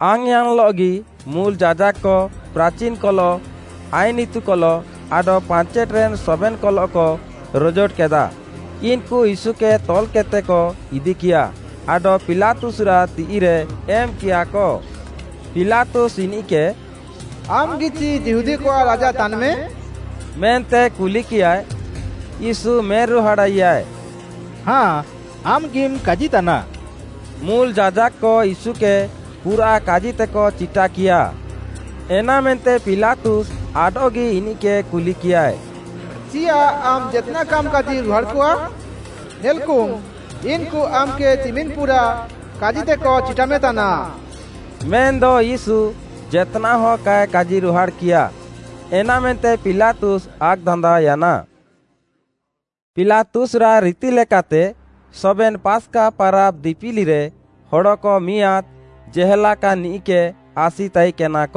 ଆଙ୍ଗ୍‌ୟାନ୍‍ଲଃଗି ମୁଲ୍‌ ଯାଜାକ୍‌କ, ପ୍ରାଚିନ୍‌କଲଃ, ଆଇନ୍‌ ଇତୁକଲଃ ଆଡଃ ପାଞ୍ଚେଟ୍‌ରେନ୍ ସବେନ୍‌କଲଃକ ରଜୋଟକେଦା। ଇନ୍‌କୁ ୟୀଶୁକେ ତଲ୍‍କେଦ୍‌ତେକ ଇଦିକିୟା, ଆଡଃ ପିଲାତୁସ୍‌ରାଃ ତିଃଇରେ ଏମ୍‍କିୟାକ। ପିଲାତୁସ୍‌ ଇନିଃକେ, “ଆମ୍‌ଗିଚି ଯିହୁଦୀକଆଃ ରାଜା ତାନ୍‌ମେ?” ମେନ୍ତେ କୁଲିକିୟାଏ। ୟୀଶୁ ମେନ୍‍ରୁହାଡ଼ାଇୟାଏ, “ହାଁ, ଆମ୍‌ଗିମ୍ କାଜିତାନା।” ମୁଲ୍‌ ଯାଜାକ୍‌କ ୟୀଶୁକେ ପୁରାଃ କାଜିତେକ ଚିଟାକିୟା। ଏନାମେନ୍ତେ ପିଲାତୁସ୍‌ ଆଡଃଗି ଇନିଃକେ କୁଲିକିୟାଏ, “ଚିୟାଃ ଆମ୍‌ ଜେତ୍‌ନାଃ କାମ୍‌ କାଜିରୁହାଡ଼ାକଆ? ନେଲ୍‌କୁମ୍, ଇନ୍‌କୁ ଆମ୍‌କେ ଚିମିନ୍‌ ପୁରାଃ କାଜିତେକ ଚିଟାମେତାନା।” ମେନ୍‌ଦ ୟୀଶୁ ଜେତ୍‌ନାଃହ କାଏ କାଜିରୁହାଡ଼୍‌କିୟା, ଏନାମେନ୍ତେ ପିଲାତୁସ୍‌ ଆକ୍‌ଦାନ୍ଦାଅୟାନା। ପିଲାତୁସ୍‌ରାଃ ରିତିଲେକାତେ, ସବେନ୍‌ ପାସ୍‌କା ପାରାବ୍ ଦିପିଲିରେ ହଡ଼କ ମିଆଁଦ୍‌ ଜେହେଲାକାନ୍‍ନିଃକେ ଆସି ତାଇକେନାକ,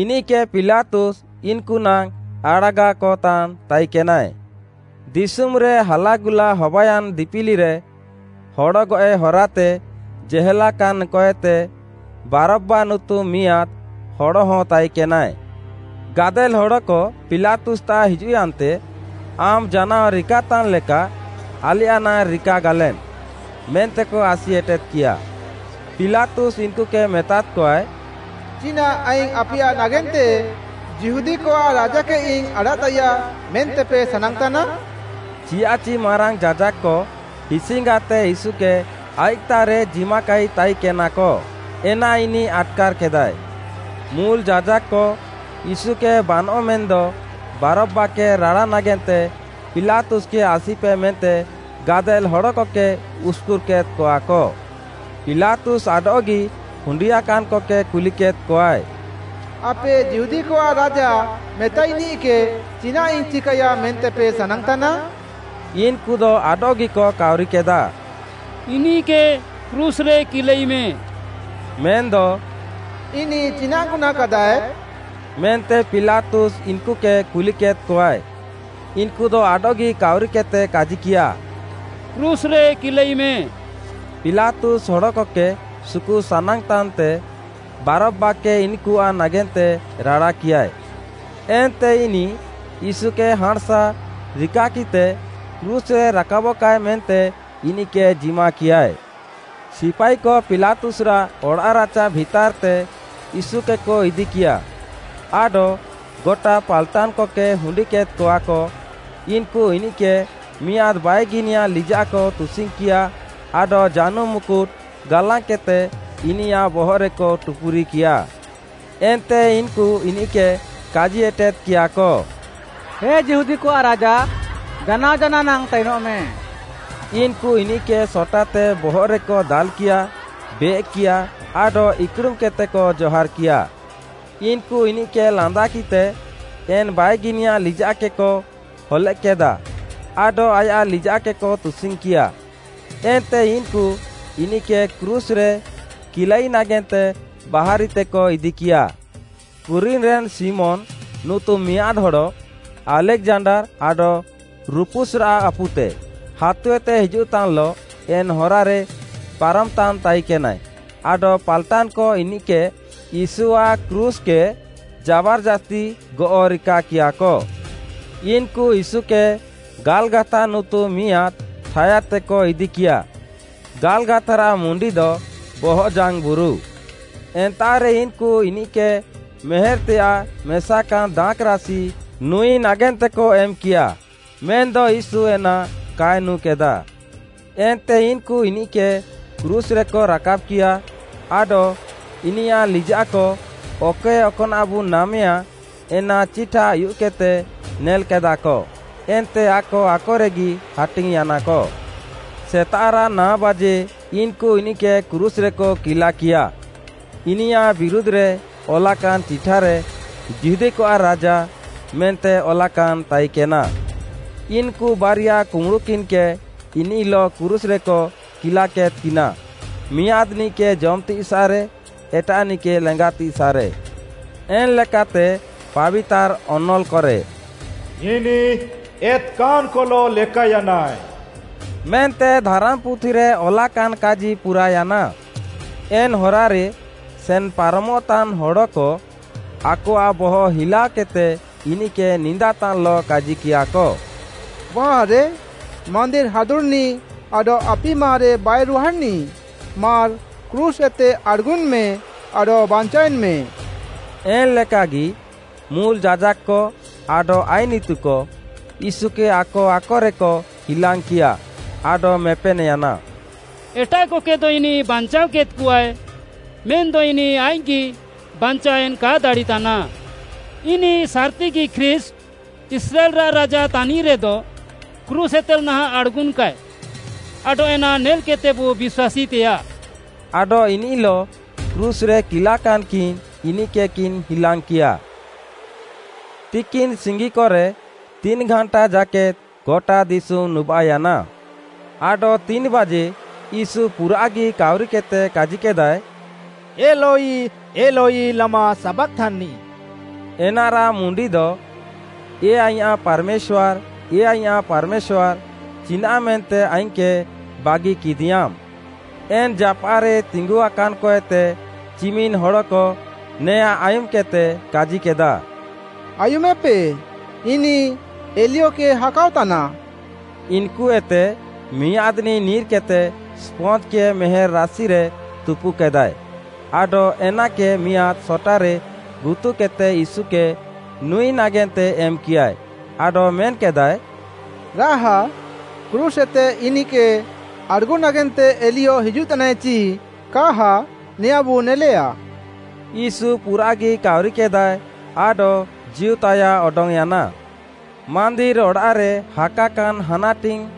ଇନିଃକେ ପିଲାତୁସ୍‌ ଇନ୍‌କୁନାଙ୍ଗ୍‌ ଆଡ଼ାଗାକତାନ୍ ତାଇକେନାଏ। ଦିଶୁମ୍‌ରେ ହାଲାଗୁଲା ହବାୟାନ୍ ଦିପିଲିରେ, ହଡ଼ଗଏଃ ହରାତେ ଜେହେଲାକାନ୍‍କଏତେ, ବାରବ୍‌ବା ନୁତୁମ୍‌ ମିଆଁଦ୍‌ ହଡ଼ହଁ ତାଇକେନାଏ। ଗାଦେଲ୍‌ ହଡ଼କ ପିଲାତୁସ୍‌ତାଃ ହିଜୁଃୟାନ୍ତେ, ଆମ୍‌ ଜାନାଅ ରିକାତାନ୍‌ ଲେକା ଆଲେୟାଃ ନାଙ୍ଗ୍‌ ରିକାଗାଲେମ୍, ମେନ୍ତେକ ଆସିଏଟେଦ୍‌କିୟା। ପିଲାତୁସ୍‌ ଇନ୍‌କୁକେ ମେତାଦ୍‌କଆଏ, “ଚିନାଃ ଆଇଙ୍ଗ୍‌ ଆପେୟାଃ ନାଗେନ୍ତେ ଯିହୁଦୀକଆଃ ରାଜାକେଇଙ୍ଗ୍‌ ଆଡ଼ାଃତାଇୟା ମେନ୍ତେପେ ସାନାଙ୍ଗ୍‌ତାନା?” ଚିୟାଃଚି ମାରାଙ୍ଗ୍‌ ଯାଜାକ୍‌କ ହିସ୍‌ଙ୍ଗାତେ ୟୀଶୁକେ ଆଇଃକ୍‌ତାଃରେ ଜିମାକାଇ ତାଇକେନାକ, ଏନା ଇନିଃ ଆଟ୍‌କାର୍‌କେଦାଏ। ମୁଲ୍‌ ଯାଜାକ୍‌କ, ୟୀଶୁକେ ବାନଃ ମେନ୍‌ଦ ବାରବ୍‌ବାକେ ରାଡ଼ା ନାଗେନ୍ତେ ପିଲାତୁସ୍‌କେ ଆସିପେ ମେନ୍ତେ ଗାଦେଲ୍‌ ହଡ଼କକେ ଉସ୍‍କୁର୍‍କେଦ୍‍କଆକ। ପିଲାତୁସ୍‌ ଆଡଃଗି ହୁଣ୍ଡିଆକାନ୍‍କକେ କୁଲିକେଦ୍‍କଆଏ, “ଆପେ ଯିହୁଦୀକଆଃ ରାଜା ମେତାଇନିଃକେ ଚିନାଃଇଙ୍ଗ୍‌ ଚିକାଇୟା ମେନ୍ତେପେ ସାନାଙ୍ଗ୍‌ତାନା?” ଇନ୍‍କୁଦ ଆଡଃଗିକ କାଉରିକେଦାଃ, “ଇନିଃକେ କ୍ରୁଶ୍‌ରେ କିଲାଇମେ।” ମେନ୍‌ଦ, “ଇନିଃ ଚିନାଃ ଗୁହ୍ନାଁକାଦାଏ?” ମେନ୍ତେ ପିଲାତୁସ୍‌ ଇନ୍‌କୁକେ କୁଲିକେଦ୍‍କଆଏ। ଇନ୍‍କୁଦ ଆଡଃଗି କାଉରିକେଦ୍‌ତେ କାଜିକିୟା, “କ୍ରୁଶ୍‌ରେ କିଲାଇମେ।” ପିଲାତୁସ୍‌ ହଡ଼କକେ ସୁକୁ ସାନାଙ୍ଗ୍‌ତାନ୍‍ତେ ବାରବ୍‌ବାକେ ଇନ୍‌କୁଆଃ ନାଗେନ୍ତେ ରାଡ଼ାକିୟାଏ। ଏନ୍ତେ ଇନିଃ ୟୀଶୁକେ ହାଁଣ୍‌ସା ରିକାକିଃତେ କ୍ରୁଶ୍‌ରେ ରାକାବଃକାଏ ମେନ୍ତେ ଇନିଃକେ ଜିମାକିୟାଏ। ସିପାଇକ ପିଲାତୁସ୍‌ରାଃ ଅଡ଼ାଃରାଚା ଭିତାର୍‌ତେ ୟୀଶୁକେକ ଇଦିକିୟା, ଆଡଃ ଗଟା ପାଲ୍‌ଟାନ୍‍କକେ ହୁଣ୍ଡିକେଦ୍‍କଆକ ଇନ୍‌କୁ ଇନିଃକେ ମିଆଁଦ୍‌ ବାଇଗିନିଆ ଲିଜାଃକ ତୁସିଙ୍ଗ୍‌କିୟାଃ ଆଡଃ ଜାନୁମ୍‌ ମୁକୁଟ୍‌ ଗାଲାଙ୍ଗ୍‌କେଦ୍‍ତେ ଇନିୟାଃ ବହଃରେକ ଟୁପୁରିକିୟା। ଏନ୍ତେ ଇନ୍‌କୁ ଇନିଃକେ କାଜି ଏଟେଦ୍‌କିୟାଃକ, “ହେ, ଯିହୁଦୀକଆଃ ରାଜା, ଜାନାଅ ଜାନାଅ ନାଙ୍ଗ୍‌ ତାଇନଃମେ।” ଇନ୍‌କୁ ଇନିଃକେ ସଟାତେ ବହଃରେକ ଦାଲ୍‍କିୟା, ବେଏକ୍‌କିୟା ଆଡଃ ଇକ୍‌ଡୁମ୍‍କେଦ୍‌ତେକ ଜହାର୍‌କିୟା। ଇନ୍‌କୁ ଇନିଃକେ ଲାନ୍ଦାକିତେ ଏନ୍‌ ବାଇଗିନିଆ ଲିଜାଃକେକ ହଲେଃକ୍‌କେଦା ଆଡଃ ଆୟାଃ ଲିଜାଃକେକ ତୁସିଙ୍ଗ୍‌କିୟା। ଏନ୍ତେ ଇନ୍‌କୁ ଇନିଃକେ କ୍ରୁଶ୍‌ରେ କିଲାଇ ନାଗେନ୍ତେ ବାହାରିତେକ ଇଦିକିୟା। କୁରିନିରେନ୍ ଶିମୋନ୍‌ ନୁତୁମ୍‌ ମିଆଁଦ୍‌ ହଡ଼, ଆଲେକ୍‌ଜାଣ୍ଡାର୍‌ ଆଡଃ ରୁପୁସ୍‍ରାଃ ଆପୁତେ, ହାତୁଏତେ ହିଜୁଃତାନ୍‌ଲଃ ଏନ୍‌ ହରାରେ ପାରମଃତାନ୍‌ ତାଇକେନାଏ, ଆଡଃ ପାଲ୍‌ଟାନ୍‍କ ଇନିଃକେକ ୟୀଶୁଆଃ କ୍ରୁଶ୍‍କେ ଜାବାର୍‌ଜାସ୍ତି ଗଅଃ ରିକାକିୟାଃକ। ଇନ୍‌କୁ ୟୀଶୁକେ ଗାଲ୍‌ଗାଥା ନୁତୁମ୍‌ ମିଆଁଦ୍‌ ଠାୟାଦ୍‌ତେକ ଇଦିକିୟା, ଗାଲ୍‍ଗାଥାରାଃ ମୁଣ୍ଡିଦ, “ବହଃଜାଙ୍ଗ୍‌ବୁରୁ”। ଏନ୍ତାଃରେ ଇନ୍‌କୁ ଇନିଃକେ ମେହେର୍‍ତେଆଃ ମେସାକାନ୍ ଦାଖ୍‌ରାସି ନୁଁଇ ନାଗେନ୍ତେକ ଏମାଇୟା, ମେନ୍‌ଦ ୟୀଶୁ ଏନା କାଏ ନୁଁକେଦାଃ। ଏନ୍ତେ ଇନ୍‌କୁ ଇନିଃକେ କ୍ରୁଶ୍‍ରେକ ରାକାବ୍‍କିଆ, ଆଡଃ ଇନିୟାଃ ଲିଜାଃକ, ଅକଏ ଅକ୍‌ନାଃବୁ ନାମେଆଁ ଏନା ଚିଠା ଉୟୁଃକେଦ୍‌ତେ ନେଲ୍‌କେଦାଃକ, ଏନ୍ତେ ଆକ ଆକରେଗି ହାଟିଙ୍ଗ୍‌ୟାନାକ। ସେତାଃରାଃ ନାଅବାଜେ ଇନ୍‌କୁ ଇନିଃକେ କ୍ରୁଶ୍‍ରେକ କିଲାକିୟାଃ ଇନିୟାଃ ବିରୁଧ୍‌ରେ ଅଲାକାନ୍‌ ଚିଠାରେ, “ଯିହୁଦୀକଆଃ ରାଜା” ମେନ୍ତେ ଅଲାକାନ୍‌ ତାଇକେନା। ଇନ୍‌କୁ ବାରିଆ କୁମ୍ବୁଡ଼ୁକିନ୍‌କେ ଇନିଃଲଃ କ୍ରୁଶ୍‍ରେକ କିଲାକେଦ୍‍କିନା, ମିଆଁଦ୍‌ନିଃକେ ଜମ୍‌ତିସାଃରେ, ଏଟାଃନିଃକେ ଲେଙ୍ଗାତିସାଃରେ। ଏନ୍‌ଲେକାତେ, ପାବିତାର୍‌ ଅନଲ୍‌କରେ, “ଏତ୍‍କାନ୍‍କଲଃ ଲେକାୟାନାଏ, ମେନ୍ତେ ଧାରାମ୍‌ପୁଥିରେ ଅଲାକାନ୍‌ କାଜି ପୁରାୟାନା।” ଏନ୍‌ ହରାରେ ସେନ୍‌ପାରମଃତାନ୍ ହଡ଼କ, ଆକଆଃ ବହଃ ହିଲାଅକେଦ୍‌ତେ ଇନିଃକେ ନିନ୍ଦାତାନ୍‌ଲଃ କାଜିକିୟାଃକ, “ବାଃରେ ମାନ୍ଦିର୍‌ ହାଦୁଡ଼୍‌ନିଃ ଆଡଃ ଆପିମାରେ ବାଇରୁହାଡ଼୍‌ନିଃ, ମାର୍‌ କ୍ରୁଶ୍‌ଏତେ ଆଡ଼୍‌ଗୁନ୍‍ମେ ଆଡଃ ବାଞ୍ଚାଅଏନ୍‍ମେ।” ଏନ୍‍ଲେକାଗି ମୁଲ୍‌ ଯାଜାକ୍‌କ ଆଡଃ ଆଇନ୍‌ ଇତୁକ, ୟୀଶୁକେ ଆକ ଆକରେକ ହିଲାଙ୍ଗ୍‌କିଆ ଆଡଃ ମେପେନ୍‍ୟାନା “ଏଟାଃକକେଦ ଇନିଃ ବାଞ୍ଚାଅକେଦ୍‍କଆଏ, ମେନ୍‌ଦ ଇନିଃ ଆଇଃକ୍‌ଗି ବାଞ୍ଚାୱେନ୍‍ କାଏ ଦାଡ଼ିତାନ୍‌। ଆମ୍‌ ସାର୍‌ତିଗି ଖ୍ରୀଷ୍ଟ୍‌, ଇସ୍ରାଏଲ୍‌ରାଃ ରାଜାତାନ୍‌ମେ ରେଦ, କ୍ରୁଶ୍‌ଏତେ ନାହାଁଃ ଆଡ଼୍‌ଗୁନ୍‍କାଏ, ଆଡଃ ଏନା ନେଲ୍‍କେଦ୍‌ତେବୁ ବିଶ୍ୱାସୀତେଆଃ।” ଆଡଃ ଇନିଃଲଃ କ୍ରୁଶ୍‌ରେ କିଲାକାନ୍‌କିନ୍‌ ଇନିଃକେକିନ୍‌ ହିଲାଙ୍ଗ୍‌କିୟା। ତିକିନ୍‌ସିଙ୍ଗିକରେ ତିନ୍‌ଘାଣ୍ଟା ଜାକେଦ୍‌ ଗଟା ଦିଶୁମ୍‌ ନୁବାଃୟାନା। ଆଡଃ ତିନ୍‌ବାଜେ ୟୀଶୁ ପୁରାଃଗି କାଉରିକେଦ୍‌ତେ କାଜିକେଦାଏ, “ଏଲୋଇ ଏଲୋଇ ଲାମା ସାବାକ୍‍ଥାନି?” ଏନାରାଃ ମୁଣ୍ଡିଦ, “ଏ ଆଇଁୟାଃ ପାର୍‌ମେଶ୍ୱାର୍‌, ଏ ଆଇଁୟାଃ ପାର୍‌ମେଶ୍ୱାର୍‌, ଚିନାଃମେନ୍ତେ ଆଇଙ୍ଗ୍‌କେ ବାଗିକିଦିୟାମ୍?” ଏନ୍‌ ଜାପାଃରେ ତିଙ୍ଗୁଆକାନ୍‍କଏତେ ଚିମିନ୍‌ ହଡ଼କ ନେଆଁଁ ଆୟୁମ୍‌କେଦ୍‌ତେ କାଜିକେଦା, “ଆୟୁମେପେ, ଇନିଃ ଏଲିୟକେ ହାକାଅତାନା।” ଇନ୍‌କୁଏତେ ମିଆଁଦ୍‌ନିଃ ନିର୍‍କେଦ୍‍ତେ ସ୍ପଞ୍ଜ୍‌କେ ମେହେର୍‌ ରାସିରେ ତୁପୁକେଦାଏ ଆଡଃ ଏନାକେ ମିଆଁଦ୍‌ ସଟାରେ ଗୁତୁକେଦ୍‌ତେ ୟୀଶୁକେ ନୁଁଇ ନାଗେନ୍ତେ ଏମ୍‌କିୟାଏ, ଆଡଃ ମେନ୍‍କେଦାଏ, “ରାହା କ୍ରୁଶ୍‌ଏତେ ଇନିଃକେ ଆଡ଼୍‌ଗୁ ନାଗେନ୍ତେ ଏଲିୟ ହିଜୁଃତାନାଏ ଚି କାହା ନେଆଁଁବୁ ନେଲେଆ।” ୟୀଶୁ ପୁରାଃଗି କାଉରିକେଦାଏ ଆଡଃ ଜୀଉତାୟାଃ ଅଡଙ୍ଗ୍‌ୟାନା। ମାନ୍ଦିର୍‌ ଅଡ଼ାଃରେ ହାକାକାନ୍‌ ହାନାଟିଙ୍ଗ୍‌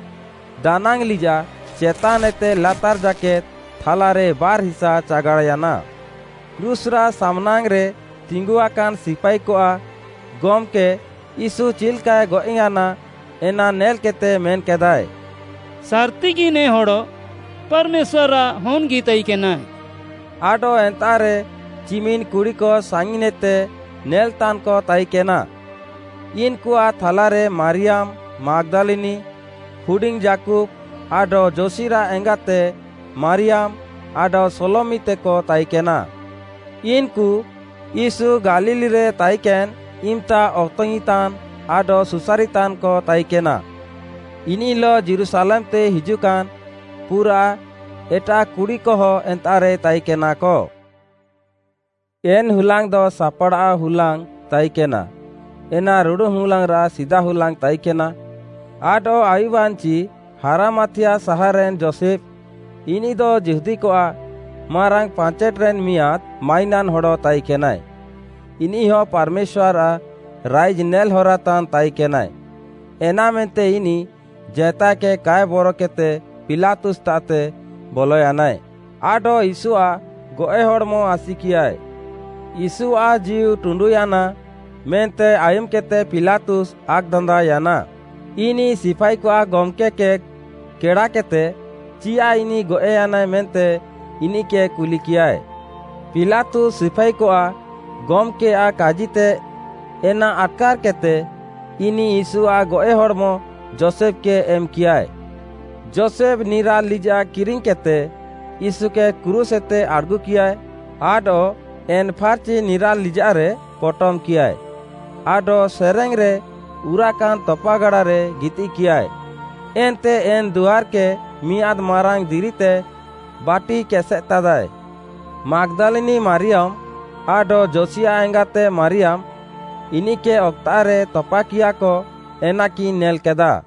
ଦାନାଙ୍ଗ୍‌ଲିଜାଃ ଚେତାନ୍‍ଏତେ ଲାତାର୍‍ ଜାକେଦ୍‌ ଥାଲାରେ ବାର୍‌ ହିସା ଚାଗାଡ଼୍‌ୟାନା। କ୍ରୁଶ୍‍ରାଃ ସାମ୍‌ନାଙ୍ଗ୍‌ରେ ତିଙ୍ଗୁଆକାନ୍‌ ସିପାଇକଆଃ ଗମ୍‌କେ ୟୀଶୁ ଚିଲ୍‌କାଏ ଗଏଃୟାନା, ଏନା ନେଲ୍‌କେଦ୍‌ତେ ମେନ୍‍କେଦାଏ, “ସାର୍‌ତିଗି ନେ ହଡ଼ ପାର୍‌ମେଶ୍ୱାର୍‌ଆଃ ହନ୍‍ଗି ତାଇକେନାଏ।” ଆଡଃ ଏନ୍ତାଃରେ ଚିମିନ୍‌ କୁଡ଼ିକ ସାଙ୍ଗିନ୍‌ଏତେ ନେଲ୍‍ତାନ୍‍କ ତାଇକେନା। ଇନ୍‌କୁଆଃ ଥାଲାରେ ମାରିୟାମ୍‌ ମାଗ୍‌ଦାଲିନି, ହୁଡିଙ୍ଗ୍‌ ଯାକୁବ୍‌ ଆଡଃ ଯୋସିରାଃ ଏଙ୍ଗାତେ ମାରିୟାମ୍‌, ଆଡଃ ସାଲୋମିତେକ ତାଇକେନା। ଇନ୍‌କୁ, ୟୀଶୁ ଗାଲିଲ୍‌ରେ ତାଇକେନ୍‌ ଇମ୍‌ତା ଅତଙ୍ଗ୍‌ଇଁତାନ୍‌ ଆଡଃ ସୁସାରିତାନ୍‍କ ତାଇକେନା। ଇନିଃଲଃ ଯୀରୁଶାଲେମ୍‌ତେ ହିଜୁଃକାନ୍ ପୁରାଃ ଏଟାଃ କୁଡ଼ିକହ ଏନ୍ତାଃରେ ତାଇକେନାକ। ଏନ୍‌ହୁଲାଙ୍ଗ୍‌ଦ ସାପ୍‌ଡ଼ାଅନ୍‌ ହୁଲାଙ୍ଗ୍‌ ତାଇକେନା, ଏନା ରୁଡ଼ୁନ୍‌ ହୁଲାଙ୍ଗ୍‌ରାଃ ସିଦାହୁଲାଙ୍ଗ୍‌ ତାଇକେନା, ଆଡଃ ଆୟୁବ୍‌ୟାନ୍‌ଚି, ହାରାମାଥିୟା ସାହାର୍‌ରେନ୍ ଯୋଷେଫ୍‌, ଇନିଃଦ ଯିହୁଦୀକଆଃ ମାରାଙ୍ଗ୍‌ ପାଞ୍ଚେଟ୍‌ରେନ୍ ମିଆଁଦ୍‌ ମାଇନାନ୍ ହଡ଼ ତାଇକେନାଏ, ଇନିଃହ ପାର୍‌ମେଶ୍ୱାର୍‌ଆଃ ରାଇଜ୍‌ ନେଲ୍‌ ହରାତାନ୍ ତାଇକେନାଏ, ଏନାମେନ୍ତେ ଇନିଃ ଜେତାଏକେ କାଏ ବରକେଦ୍‌ତେ ପିଲାତୁସ୍‌ତାଃତେ ବଲୟାନାଏ ଆଡଃ ୟୀଶୁଆଃ ଗଏଃ ହଡ଼୍‌ମ ଆସିକିୟାଏ। ୟୀଶୁଆଃ ଜୀଉଟୁଣ୍ଡୁୟାନା ମେନ୍ତେ ଆୟୁମ୍‌କେଦ୍‌ତେ ପିଲାତୁସ୍‌ ଆକ୍‌ଦାନ୍ଦାଅୟାନା। ଇନିଃ ସିପାଇକଆଃ ଗମ୍‌କେ କେ କେଡ଼ାକେଦ୍‍ତେ, ଚିୟାଃ ଇନିଃ ଗଏଃୟାନାଏ ମେନ୍ତେ ଇନିଃକେ କୁଲିକିୟାଏ। ପିଲାତୁସ୍‌ ସିପାଇକଆଃ ଗମ୍‌କେୟାଃ କାଜିତେ ଏନା ଆଟ୍‌କାର୍‌କେଦ୍‌ତେ, ଇନିଃ ୟୀଶୁଆଃ ଗଏଃହଡ଼୍‌ମ ଯୋଷେଫ୍‌କେ ଏମ୍‌କିୟାଏ। ଯୋଷେଫ୍‌ ନିରାଲ୍‌ ଲିଜାଃ କିରିଙ୍ଗ୍‌କେଦ୍‌ତେ ୟୀଶୁକେ କ୍ରୁଶ୍‌ଏତେ ଆଡ଼୍‌ଗୁକିଆଏ ଆଡଃ ଏନ୍‌ ଫାର୍‌ଚି ନିରାଲ୍‌ ଲିଜାଃରେ ପଟମ୍‍କିୟାଏ, ଆଡଃ ସେରେଙ୍ଗ୍‌ରେ ଉରାକାନ୍ ତପାଗାଡ଼ାରେ ଗିତିଃକିୟାଏ। ଏନ୍ତେ ଏନ୍‌ ଦୁଆର୍‌କେ ମିଆଁଦ୍‌ ମାରାଙ୍ଗ୍‌ ଦିରିତେ ବାଟିକେସେଦ୍‍ତାଦାଏ। ମାଗ୍‌ଦାଲିନି ମାରିୟାମ୍‌ ଆଡଃ ଯୋସିଆଃ ଏଙ୍ଗାତେ ମାରିୟାମ୍‌ ଇନିଃକେ ଅକ୍‌ତାଃରେ ତପାକିୟାକ ଏନାକିନ୍ ନେଲ୍‌କେଦା।